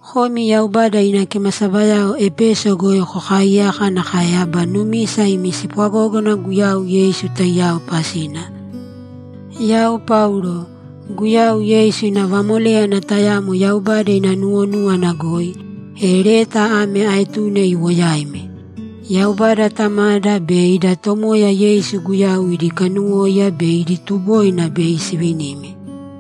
Komi Yaubada ina kimasabayao Epeso goi kokaaiyaka nakae aba numisa imi spwagógana Guyau Yeisu taiyao pasina, Yau Paulo, Guyau Yeisu ina vamoléyana tayamo Yaubada ina nuwonúwana goi, e leta ame aetune iwo yaimi. Yaubada Tamada be ida Tomoya Yeisu Guyau idi kanuwóiya be idi tuboina bei sivinimi.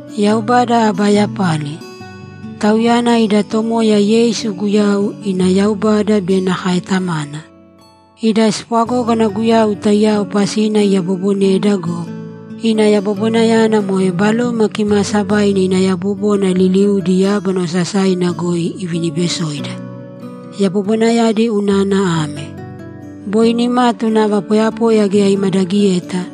Yaubada aba yapali! Tauyana ida Tomoya Yeisu Guyau ina Yaubada be nakae Tamana. Ida spwagógana Guyau taiyao pasina iyaboboneda go, ina yabobonayana moe Baloma Kimaasabaina ina yabobona liliudi yábana osasaina goi iviniibesoida. Yabobonayadi unana ame: Boi nimatu nava poyapoya geya imadagiyeta,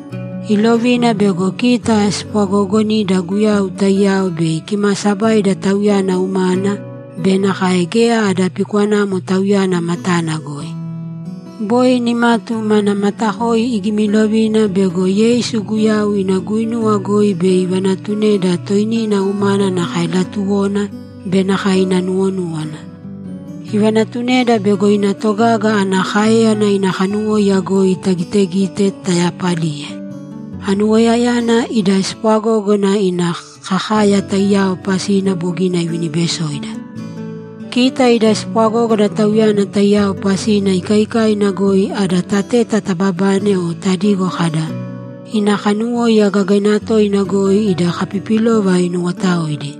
ilovina bego kita spwagoogonida Guyau taiyao bei kimaasabaida Tauyana umana be nakae geya ada pikwanamo Tauyana matana goi. Boi nimatu mana matakoi igimilovina bego Yeisu Guyau ina guinuwa goi bei ivanatuneda toinina umana nakae latuwona be nakae ina nuwonúwana. Ivanatuneda bego ina togaga ana káeyana ina kanuwóiya goi tagitegite tayapaliye. Anuwoiyayana ida spwagógana ina kakaya taiyao pasina bogina ivinibesoida. Kita ida spwagógana Tauyana taiyao pasina ikaikaina goi ada tateta tababane o tadigo kada, ‘Ina kanuwóiya gagaina toina goi ida kapipilova inuwotaoidi.’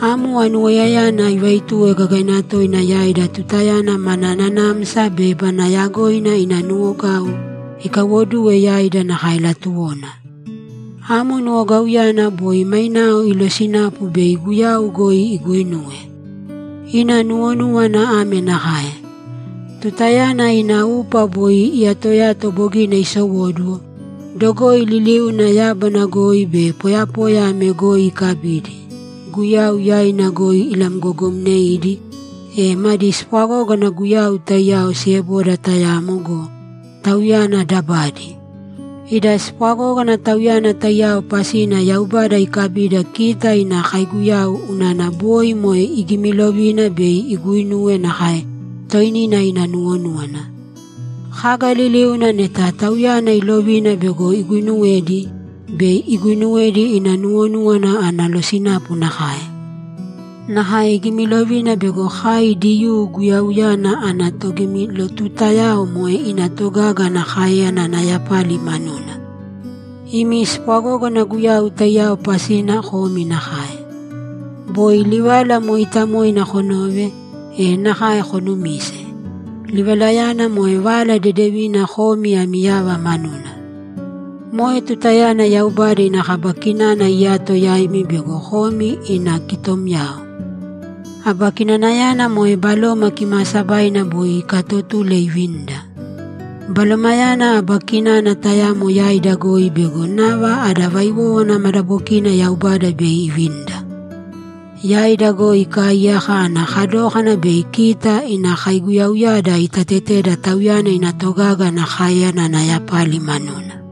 Amo anuwoiyayana ivaituwe gagaina toina yaida tutayana mana nanamsa be mana yagoina ina nuwogau ikaiwoduwe yaida nakae latuwona. Amo nuwogauyana boi mainao ilosinapu bei Guyau goi iguinuwe. Ina nuwonúwana ame nakae: Tutayana ina upa boi iyatoyato bogina isowóduwo, dogoi liliuna yábana goi be poyapoya ame goi ikabidi, Guyau yaina goi ilamgogomneidi, e madi spwagógana Guyau taiyao sieboda tayamo go, Tauyana dabadi. Ida spwagógana Tauyana taiyao pasina Yaubada ikabida kita ina kaiguyau unana boi moe igimilovina bei iguinuwe nakae toinina ina nuwonúwana. Kaga liliuna neta Tauyana iilovina bego iguinuwedi, bei iguinuwedi ina nuwonúwana ana losinapu nakae. Nakae igimilovina bego kai Diyuu Guyauyana ana togimilotutayao moe ina togaga ana káeyana ana yapali manuna. Imi spwagógana Guyau taiyao pasina komi nakae. Boi livala mooitamoina konove, e nakae konumise. Livalayana moe Vala Dedevina komi ami yava manuna. Moe tutayana Yaubada ina kaba kinana iyato yaimi bego komi ina kitomyao. Aba kinanayana moe Baloma Kimaasabaina boi ikaatotule ivinida. Balomayana aba kinana tayamo yaida goi bego nava ada vaiwówana madabokina Yaubada bei ivinida. Yaida goi ikaaiyaka ana kadókana bei kita ina kaiguyauyada itateteda Tauyana ina togaga ana káeyana ana yapali manuna.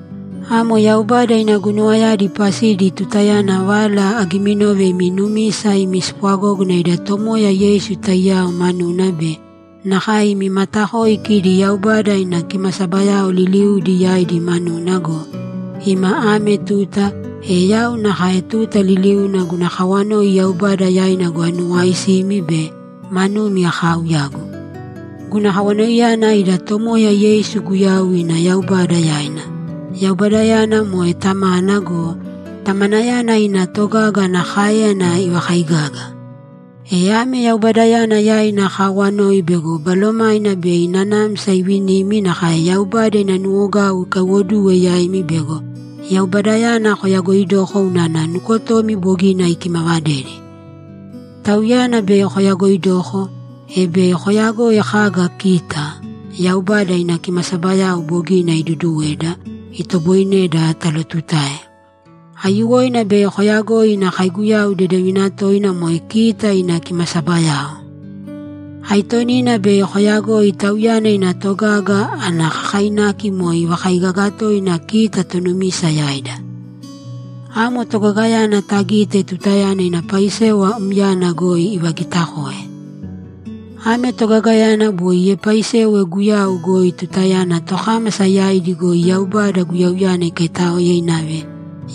Amo Yaubada ina guinuwayadi pasidi tutayana vala agiminove imi numisa imi spwagógana ida Tomoya Yeisu taiyao manuna be nakae imi matakoi kidi Yaubada ina kimasabayao liliudi yaidi manuna go, ima ame tuta, e yau nakae tuta liliuna guna kawanoi Yaubada yaina goi anuwaisimi be manumi akaauyagu. Guna kawanoiyana ida Tomoya Yeisu Guyau ina Yaubada yaina; Yaubadayana moe Tamana go, Tamanayana ina togaga ana káeyana ivakaigaga. E ame Yaubadayana yaina akaawanoi bego Balomaina bei nanamsa ivinimi nakae Yaubada ina nuwogau ikaiwoduwe yaimi bego Yaubadayana koyagoidoko unana nukotomi bogina ikimavadedi. Tauyana bei koyagoidoko, e bei koyagoi kaga kita, Yaubada ina kimasabayao bogina iduuduweda, itoboineda talotutae. Aiyuwoina bei koyagoi ina kaiguyau dedevina toina moe kita ina kimasabayao. Aitonina bei koyagoi Tauyana ina togaga ana kakainaki moe ivakaigaga toina kita tonumisa yaida. Amo togagayana tagite tutayana ina paisewa myana goi ivagitakoe. Ame togagayana boi iepaisewe Guyau goi tutayana tokámasa yaidi goi Yaubada Guyauyana ikaitáoe inave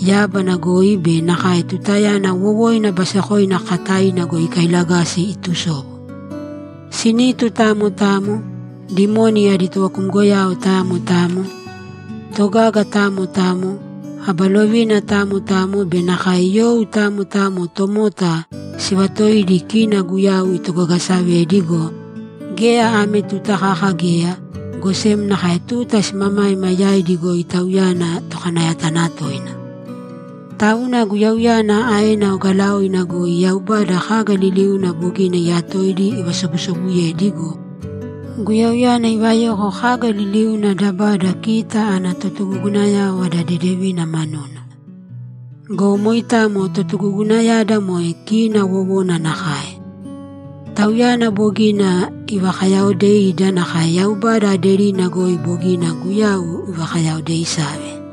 yábana goi be nakae tutayana wowoina basekoina kakataina goi ikailagasi itusobu. Sinitu tamo tamo, dimoni adi tovakumgoyao tamo tamo, totogaga tamo tamo, aba lovina tamo tamo be nakae you tamo tamo tomota sivaatoidi kina Guyau itogagasavedi go, geya ame tuta kaka geya, go sem nakae tuta simamaima yaidi goi Tauyana Tokanayatanatoina. Tauna Guyauyana aena ogalaoina goi Yaubada kaga liliuna bogina iyatoidi ivasobusobuyedi go, Guyauyana ivayoko kaga liliuna dabada kita ana totugugunayao ada dedevina manuna. Go moitamo totugugunayada moe kina wowona nakae. Tauyana bogina ivakayaaodeida nakae Yaubada aderina goi bogina Guyau ivakayaoodeisave.